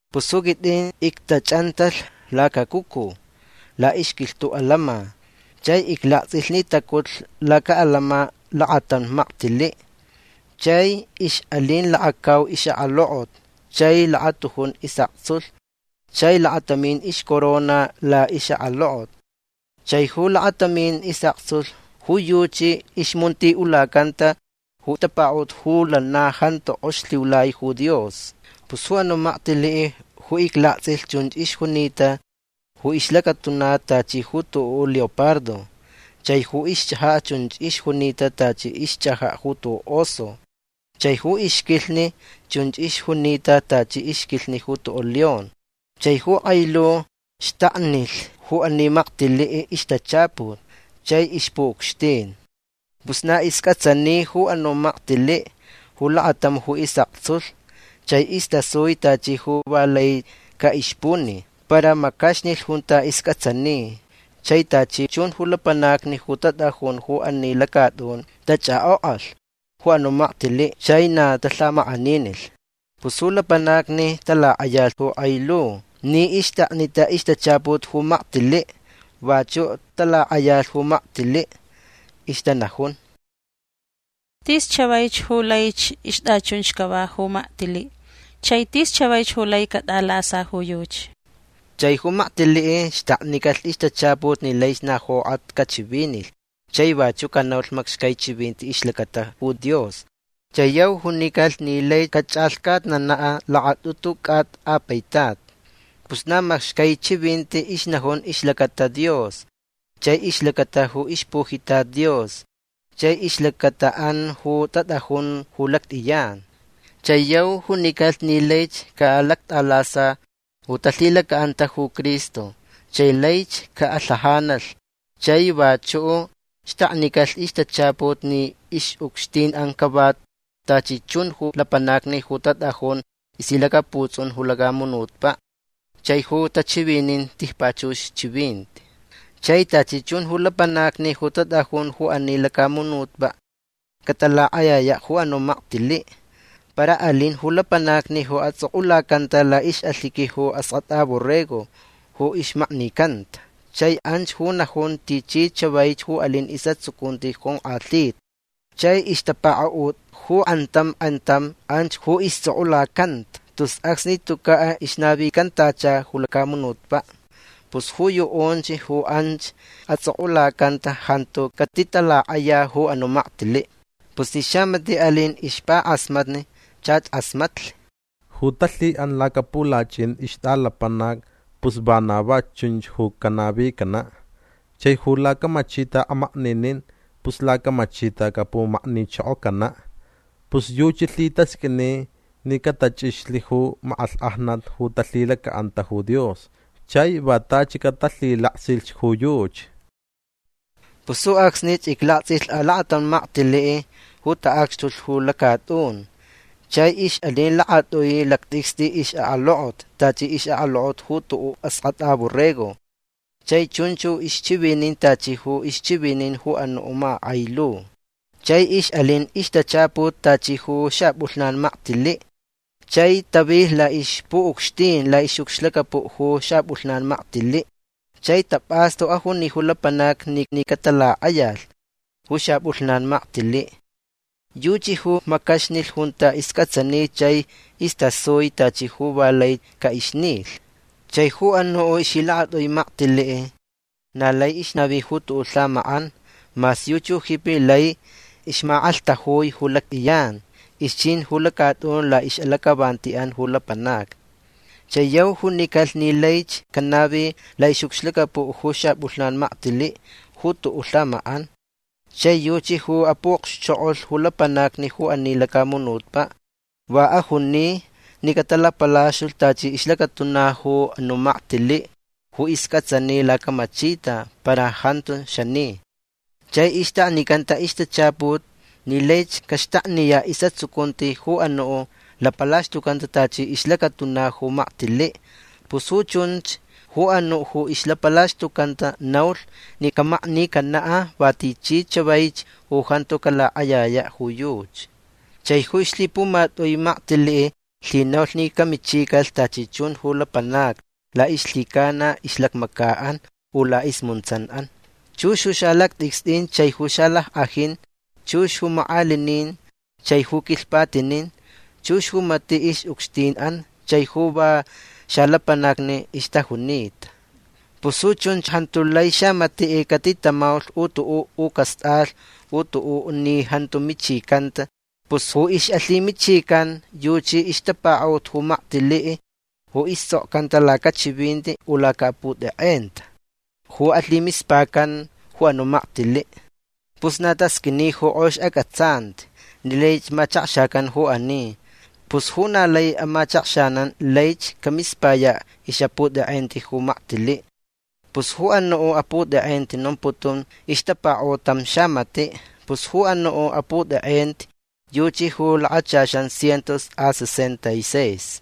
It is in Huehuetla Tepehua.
Pus ju quitʼin ictachʼantalh lacacucu laʼixquilhtuʼ alama. Chai iclaktsʼilh ni tacutlh lacaʼalama lakatam maktiliʼ. Chai ixʼalin lakacau ixʼakalokot chai lakatujun isʼaktsulh chai lakatamin ixcorona laʼixʼakalokot. Chai ju lakatamin isʼaktsulh ju yuchi ixmuntiʼulacanta ju tapakaʼut ju lana jantu kʼox lhiulai ju Dios. Pus ju anuʼ maktiliʼ ju iclaktsʼilh chunch ixjunita ju ixlacatuna tachi ju tuʼuʼ leopardo. Chai ju ixchʼajaʼ chunch ixjunita tachi ixchʼajaʼ ju tuʼuʼ oso. Chai ju ixquilhni chunch ixjunita tachi ixquilhni ju tuʼuʼ león. Chai ju kʼai lu xtaknilh ju ani maktiliʼ ixtachaput chai ixpuʼucxtin. Pus na iscʼatsani ju anuʼ maktiliʼ ju lakatam ju isʼaktsulh. Chai istasui tachi ju va lai caʼixpuni. Para macaxnilh junta iscʼatsani. Chai tachi chun ju lapanacni ju tatʼajun ju ani lacatʼun tachʼakʼokʼalh ju anuʼ maktiliʼ chai na talhamakʼaninilh. Pus ju lapanacni talakʼayalh ju kʼai lu ni ixtaknita ixtachaput ju maktiliʼ. Vachuʼ talakʼayalh ju maktiliʼ. Ixtanajun: ―Tis chavaich ju laich ixtʼachunch cava ju maktiliʼ. Chai tis chavaich ju lai catʼalasa ju yuchi. Chai ju maktiliʼ xtaknicalh ixtachaput ni laich na jokʼat cachivinilh chai vachuʼ canaulh macxcai chivinti ixlacata ju Dios. Chai yau junicalh ni laich cachʼalhcatnanaʼ lakatʼutu cʼata a paitat. Pus na macxcai chivinti ixnajun ixlacata Dios chai ixlacata ju ixpujitat Dios chai ixlacataʼan ju tatʼajun ju lactʼiyan. Chai yau junicalh ni laich caʼalactʼalasa ju talhilacaʼanta ju Cristo chai laich caʼalhajanalh. Chai vachuʼ xtaknicalh ixtachaput ni ixʼucxtinʼan cava tachi chun ju lapanacni ju tatʼajun ixlhilacaputsʼun ju lacamunutpaʼ chai ju tachivinin tijpachux chivinti. Chai tachi chun ju lapanacni ju tatʼajun ju ani lacamunutpaʼ catalakʼayayaʼ ju anuʼ maktiliʼ. Para alin ju lapanacni ju atsʼokʼulacanta laʼixʼalhiqui ju Askʼatʼa Borrego ju ixmaknicanta. Chai anch ju najun tichi chavaich ju alin isʼatsucunti jonkʼalhita. Chai ixtapakaʼut ju kʼantam kʼantam anch ju istsʼokʼulacanta tus acsni tucaʼ ixnavicantacha ju lacamunutpaʼ. Pus ju yuʼunch ju anch atsʼokʼulacanta jantu catitalakʼaya ju anuʼ maktiliʼ. Pus ni xamatiʼ alin ixpakʼasmatni chach kʼasmatlh. Ju talhiʼan lacapulachʼin ixtʼalapanac pus vana va chunch ju canavicanaʼ. Chai ju lacamachita amakninin pus lacamachita capumaknichokocanaʼ. Pus yuchi lhitasqʼuini ni catachʼixlh ju makʼalhkʼajnat ju talhilacaʼanta ju Dios chai va tachi catalhilaksilhch ju yuchi. Pus ju acsnich iclaktsʼilh alakatam maktiliʼ ju taʼacxtulh ju lacatʼun. Chai ixʼalin lakatʼui lactʼicstʼi ixʼakalokot tachi ixʼakalokot ju tuʼuʼ askʼatʼa borrego. Chai chunch ju ixchivinin tachi ju ixchivinin ju anuʼ makakʼai lu. Chai ixʼalin ixtachaput tachi ju xapʼulhnan maktiliʼ. Chai tavilh laʼixpuʼucxtin laʼixʼucxlacapuʼ ju xapʼulhnan maktiliʼ chai tapʼastu ajuni ju lapanacni ni catalakʼayalh ju xapʼulhnan maktiliʼ. Yuchi ju macaxnilh junta iscʼatsani chai istasui tachi ju va lai caʼixnilh. Chai ju anuʼ ixlhilakatʼui maktiliʼ na lai ixnavi ju tuʼuʼ lhamakʼan. Mas yuchi ju jipi lai ixmakʼalhtajui ju lactʼiyan. Ixchin ju lacatʼun laʼixʼalacʼavantiʼan ju lapanacni. Chai yau junicalh ni laich canavi laʼixʼucxlacapuʼ ju xapʼulhnan maktiliʼ ju tuʼuʼ lhamakʼan. Chai yuchi ju apuʼokxchokʼolh ju lapanacni ju ani lacamunutpaʼ. Va ajuni ni catalapalaxtulh tachi ixlacatuna ju anuʼ maktiliʼ ju iscʼatsani lacamachita para jantu xani. Chai ixtaknicanta ixtachaput ni laich caxtakniyaʼ isʼatsucunti ju anuʼ lapalaxtucanta tachi ixlacatuna ju maktiliʼ. Pus ju chunch ju anuʼ ju ixlapalaxtucanta naulh ni camaknicanaʼ va tichi chavaich ju jantu calakʼayayaʼ ju yuchi. Chai ju ixlhipumatʼui maktiliʼ lhinaulh ni camichicalh tachi chun ju lapanacni laʼixlhicana ixlacmacaʼan u laʼismuntsanʼan. Chux ju xalactʼicstʼin chai ju xalackʼajin. Chux ju makʼalinin chai ju quilhpatinin. Chux ju matiʼ ixʼucxtinʼan chai ju va xalapanacni ixtajunita. Pus ju chunch jantu lai xamatiʼ catitamaulh ju tuʼuʼ u castʼalh ju tuʼuʼ ni jantu michicanta. Pus ju ixʼalhimichican yuchi ixtapakaʼut ju maktiliʼ ju istsʼokcanta lacachivinti u lacaʼaputekʼenta ju alhimispacan ju anuʼ maktiliʼ. Pus na tasqʼuini ju kʼox acʼatsanti ni lai machakxacan ju ani. Pus ju na lai amachakxanan laich camispayaʼ ixʼaputekʼenti ju maktiliʼ. Pus ju anuʼ aputekʼenti nomputun ixtapakaʼut tam xamatiʼ. Pus ju anuʼ aputekʼenti yuchi ju lakachaxan cientos a sesenta y seis.